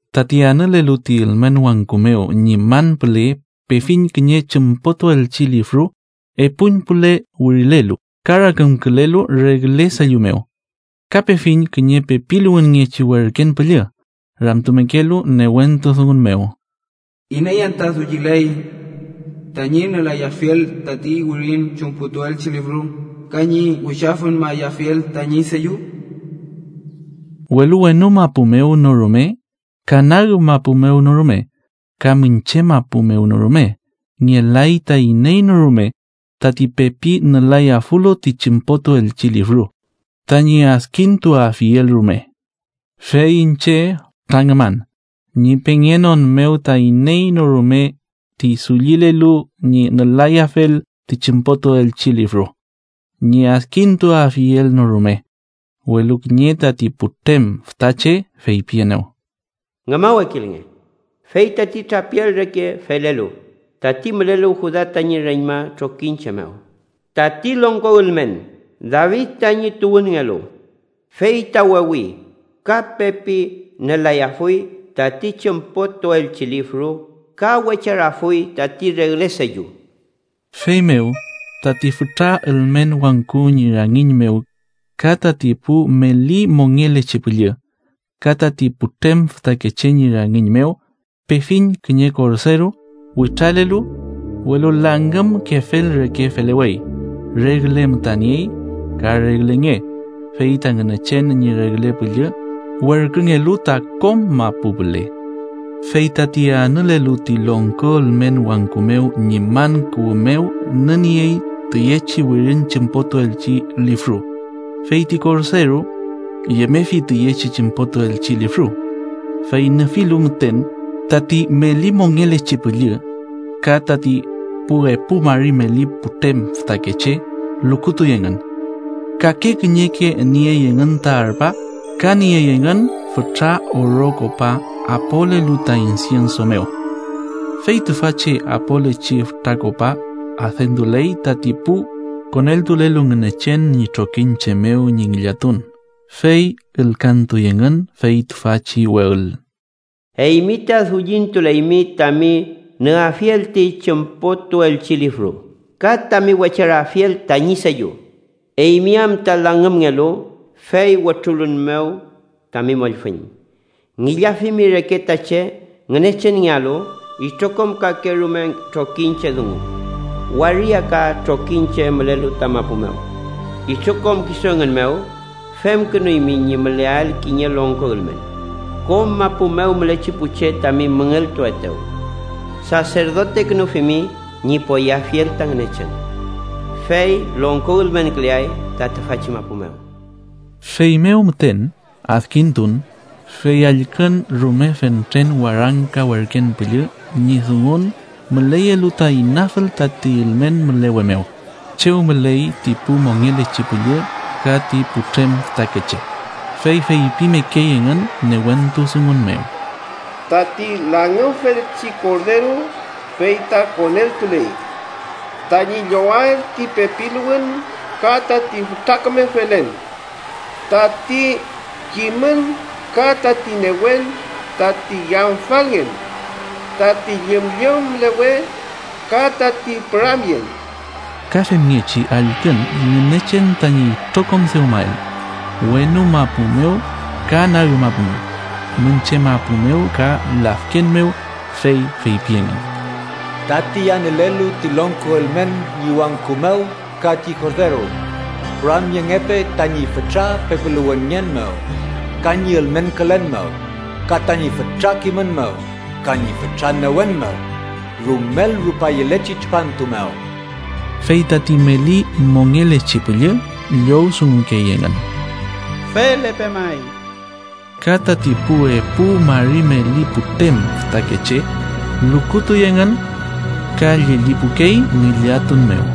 Tati anülelu ti ülmen wangku mew ñi man püle pefiñ kiñe chümpotuelchi lifru epuñpüle wirilelu, ka rakümkülelu regle sellu mew. Ka pefiñ kiñe pepiluwünngechi werken püllü ramtumekelu newentu dungun mew: “¿Iney anta dulliley tañi nülayafiel tati wirin chümpotuelchi lifru ka ñi wichafüñmayafiel tañi sellu?” Welu wenu mapu mew no rume ka nag mapu mew no rume ka miñche mapu mew no rume ngelay ta iney no rume tati pepi nülayafulu ti chümpotuelchi lifru, tañi adkintuafiel rume. Fey iñche fütra ngüman, ñi pengenon mew ta iney no rume ti dullilelu ñi nülayafel ti chümpotuelchi lifru, ñi adkintuafiel no rume. Welu kiñe tati putrem fütache feypienew: “Ngümawekilnge, fey tati trapial reke felelu, tati mülelu Juda tañi reñma trokiñche mew, tati longko ülmen David tañi tuwünngelu, fey ta wewi ka pepi nülayafuy tati chümpotuelchi lifru ka wecharafuy tati regle sellu.” Feymew, tati fütra ülmen wangku ñi rangiñ mew ka tati pu meli mongelechi püllü, ka tati putrem fütakeche ñi rangiñ mew, pefiñ kiñe Korderu. Witralelu, welu langümkefel reke felewey. Regle müta niey ka regle nge, fey ta Ngünechen ñi regle püllü werküngelu ta kom mapu püle. Fey tati anülelu ti longko ülmen wangku mew ñi man kuwü mew nüniey tiyechi wirin chümpotuelchi lifru, fey ti Korderu yemefi tiyechi chümpotuelchi lifru, fey nüfilu müten, tati meli mongelechi püllü ka tati pu epu mari meli putrem fütakeche lukutuy engün, kake kiñeke niey engün ta arpa, ka niey engün fütra oro kopa apolelu ta insienso mew, fey tüfachi apolechi fütra kopa adentuley tati pu koneltulelu Ngünechen ñi trokiñche mew ñi ngillatun. Fey ülkantuy engün fey tüfachi we ül: “Eymi ta dullintuleymi tami nüafiel ti chümpotuelchi lifru ka tami wecharafiel tañi sellu, eymi am ta langümngelu, fey wütrulün mew tami mollfüñ. Ngillafimi reke ta che Ngünechenngealu itrokom kakerume trokiñche, dungun, waria ka trokiñche mülelu ta mapu mew. Itrokom kisu engün mew femkünuymi ñi müleael kiñe longko ülmen. Kom mapu mew mülechi pu che tami müngeltuetew saserdotekünufimi ñi poyeafiel ta Ngünechen, fey longko ülmenküleay ta tüfachi mapu mew.” Feymew müten adkintun, fey allkün rume fentren warangka werken püllü ñi dungun müleyelu ta inafül tati ülmen mülewe mew, chew müley ti pu mongelechi püllü ka ti putrem fütakeche. Fey feypimekey engün newentu dungun mew: “¡Tati langümfelchi Korderu fey ta koneltuley tañi llowael ti pepiluwün ka tati fütra küme felen, tati kimün ka tati newen, tati yamfalngen, tati llümllüm mülewe ka tati püramyen!” Ka femngechi allkün Ngünechen tañi itrokom dewmael wenu mapu mew ka nag mapu mew, miñche mapu mew ka lafken mew, fey feypi engün: “¡Tati anülelu ti longko ülmen ñi wangku mew ka ti Korderu, püramyengepe tañi fütra pepiluwünngen mew ka ñi ülmenkülen mew, ka tañi fütra kimün mew ka ñi fütra newen mew rumel rupaleyechi tripantu mew!” Fey tati meli mongelechi püllü llowdungukey engün: ¡Felepe may! Ka tati pu epu mari meli putrem fütakeche lukutuy engün ka llellipukey ngillatun mew.